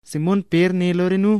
Simón Pér né lo re nu: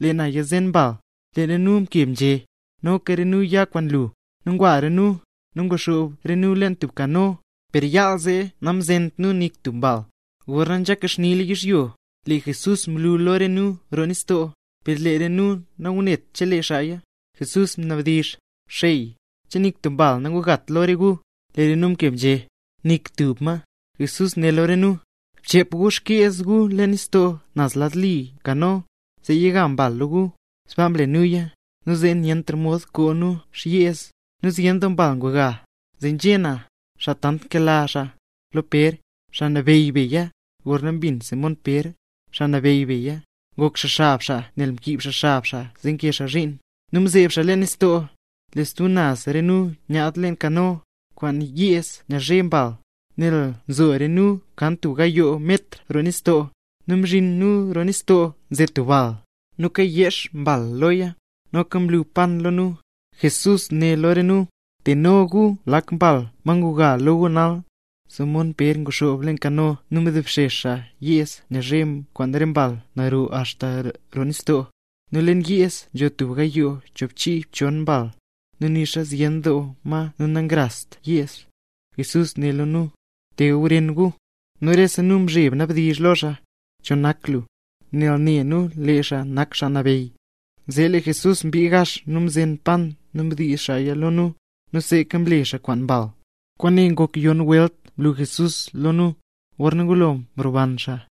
—Lee na yazen mbal. Lee re nu mkeb nzhé: —Noka re nu ya kwaan lu. Zee ngwa re nu, nu nguxoob re nu lo tub kano, per yaal zee namzent nu nik tub mbal. Gorna nzeka xnila yizhyo, lee Jesús mlu lo re nu roo nistoo, per lee re nu nangunet chelee xaaya. Jesús mnabdizh: —Xey, ¿che nik tub mbal nangugat lo re gu? Lee re nu mkeb nzhé: —Nik tub ma. Jesús né lo re nu: —Bchep gu xkyeez gu leen nis naz lad li kano, zee yiga mbal lo gu. Sbaa mle nuya, nu zee nyentra mod koo nu yeez, nel zyen doo mbal nguga. Zee nzhé na, xaa tant nkela xaa, lo Pér: —¡Xaa Nabeyy beya! Gorna mbin Simón Pér, Xaa Nabeyy beya, ngok xaa xab xaa (nel mkiib xaa xab xaa zee kee xaa zhiin), nu mzeeb xaa leen nistoo. Lee stub naz re nu nyaad leen kano, kwaan yeez nyazhe mbal, nel nzo re nu kan tub gayoo metr roo nistoo. Nu mzhin nu roo nistoo nze tub bal, nu kayeex mbal loya, noka mlu pan lo nu, Jesús né lo re nu: —Teno gu lak mbal, ma nguga lo gu nal. Simón Pér nguxoob leen kano nu mdobxex xaa yeez nyazhe kwaan re mbal naro axta roo nistoo; nu leen yeez nzho tub gayoo choobchiibchon mbal, nu nixa zyen doo ma nu namrazt yeez. Jesús né lo nu: —Te gawren gu. Nu rese nu mzheb ngnabdizh lo xaa: “¿Cho nak lu?”, nel ne nu lee xaa nak Xaa Nabeyy. Zee lee Jesús mbii gax nu mzen pan nu mdiiz xaaya lo nu, nu sneeka mle xaa kwaan mbal. Kwaane ngok yonn welt mlu Jesús lo nu, gorna ngulo mroban xaa.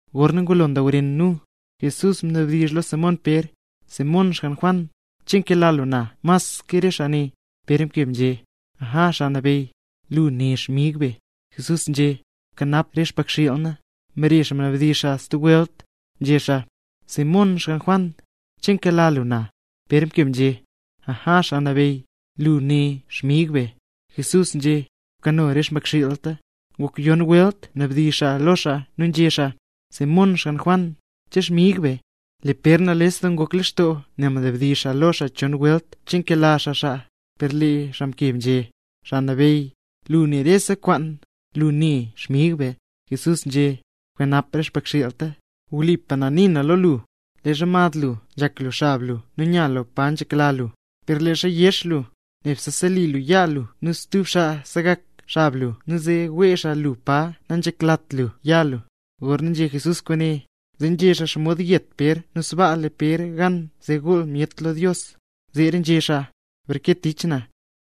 Gorna ngulo ndawren re nu, Jesús mnabdizh lo Simón Pér: —Simón, xgann Juan, ¿che nkela lu na mas ke re xaa ne? Pér mkeb nzhé: —Aja, Xaa Nabeyy, lu ne xmig be. Jesús nzhé: —Bkanap re xmbakxiil na. Mbare xaa mnabdizh xaa stub welt, nzhé xaa: —Simón, xgann Juan, ¿che nkela lu na? Pér mkeb nzhé: —Aja, Xaa Nabeyy, lu ne xmig be. Jesús nzhé: —Bkano re xmbakxiilta. Ngok yonn welt mnabdizh xaa lo xaa nu nzhé xaa: —Simón, xgann Juan, ¿che xmig be? —Lee Pér nales doo ngok lextoo nel mnabdizh xaa lo xaa chon welt che nkela xaa xaa, nu lee xaa mkeb nzhé: —Xaa Nabeyy, lu ne rese kwaan, lu ne xmig be. Jesús nzhé: —Bkanap re xmbakxiilta. Wlipa na nii na lo lu, leezha mad lu nzhak lu xab lu nu nya lu pa nzhak yek lu, per leezha yex lu, nebse seli lu yaa lu nu stub xaa segak xab lu nu wee xaa lu pa nanzheklat lu ya lu. Gorna nzhé Jesús kwaane, zee nzhé xaa xomod yet Pér nu sbaa le Pér gan zee gool myet lo Dios. Zeera nzhé xaa: —¡Breke tich na!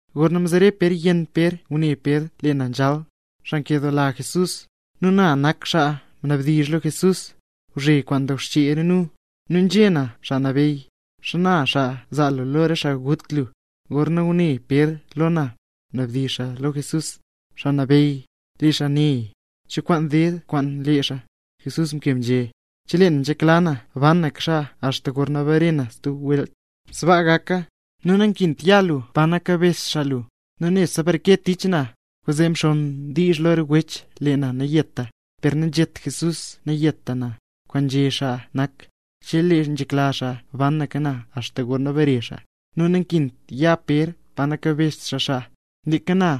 Gorna mzere Pér yenn Pér ngune Pér lee na nzhal, xaa nkedoola Jesús. Nu na nak xaa mnabdizh lo Jesús, ngwzhe kwaan ndawxchee re nu, nu nzhé na: “Xaa Nabeyy, ¿xana xaa zaa lu lo re xaa gut lu?” Gorna ngune Pér lo na, mnadizh xaa lo Jesús: —Xaa Nabeyy, lee xaa nee, ¿cho kwaan ded kwaan lee xaa? Jesús mkeb nzhé: —Chelee na nzhekla na banaka xaa axta gorna bare na stub welt, sbaa gaka. ¡Nu nakint ya lu pa nakabezht xaa lu! Lu nebse breke tich na. Kwaanzee mxonn diizh lo re wech lee na nayeta. Per nanzhét Jesús nayeta na, kwaan nzhé xaa nak, chelee nzhekla xaa banaka na axta gorna bare xaa, nu nakint ya Pér pa nakabezht xaa xaa. Leeka na,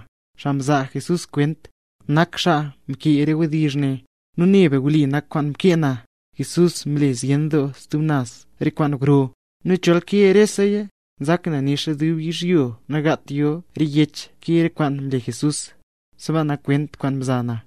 xaa mzaa Jesús kwent, nak xaa mkee re wdizh ne. Nu ne be wli nak kwaan mkee na. Jesús mle zyen doo stub naz re kwaan gro; nu chol nkee reseya, nzak na nixa dub yizhyo nagaat yo re yech nkee re kwaan mle Jesús. Sbaa nak kwent kwaan mza na.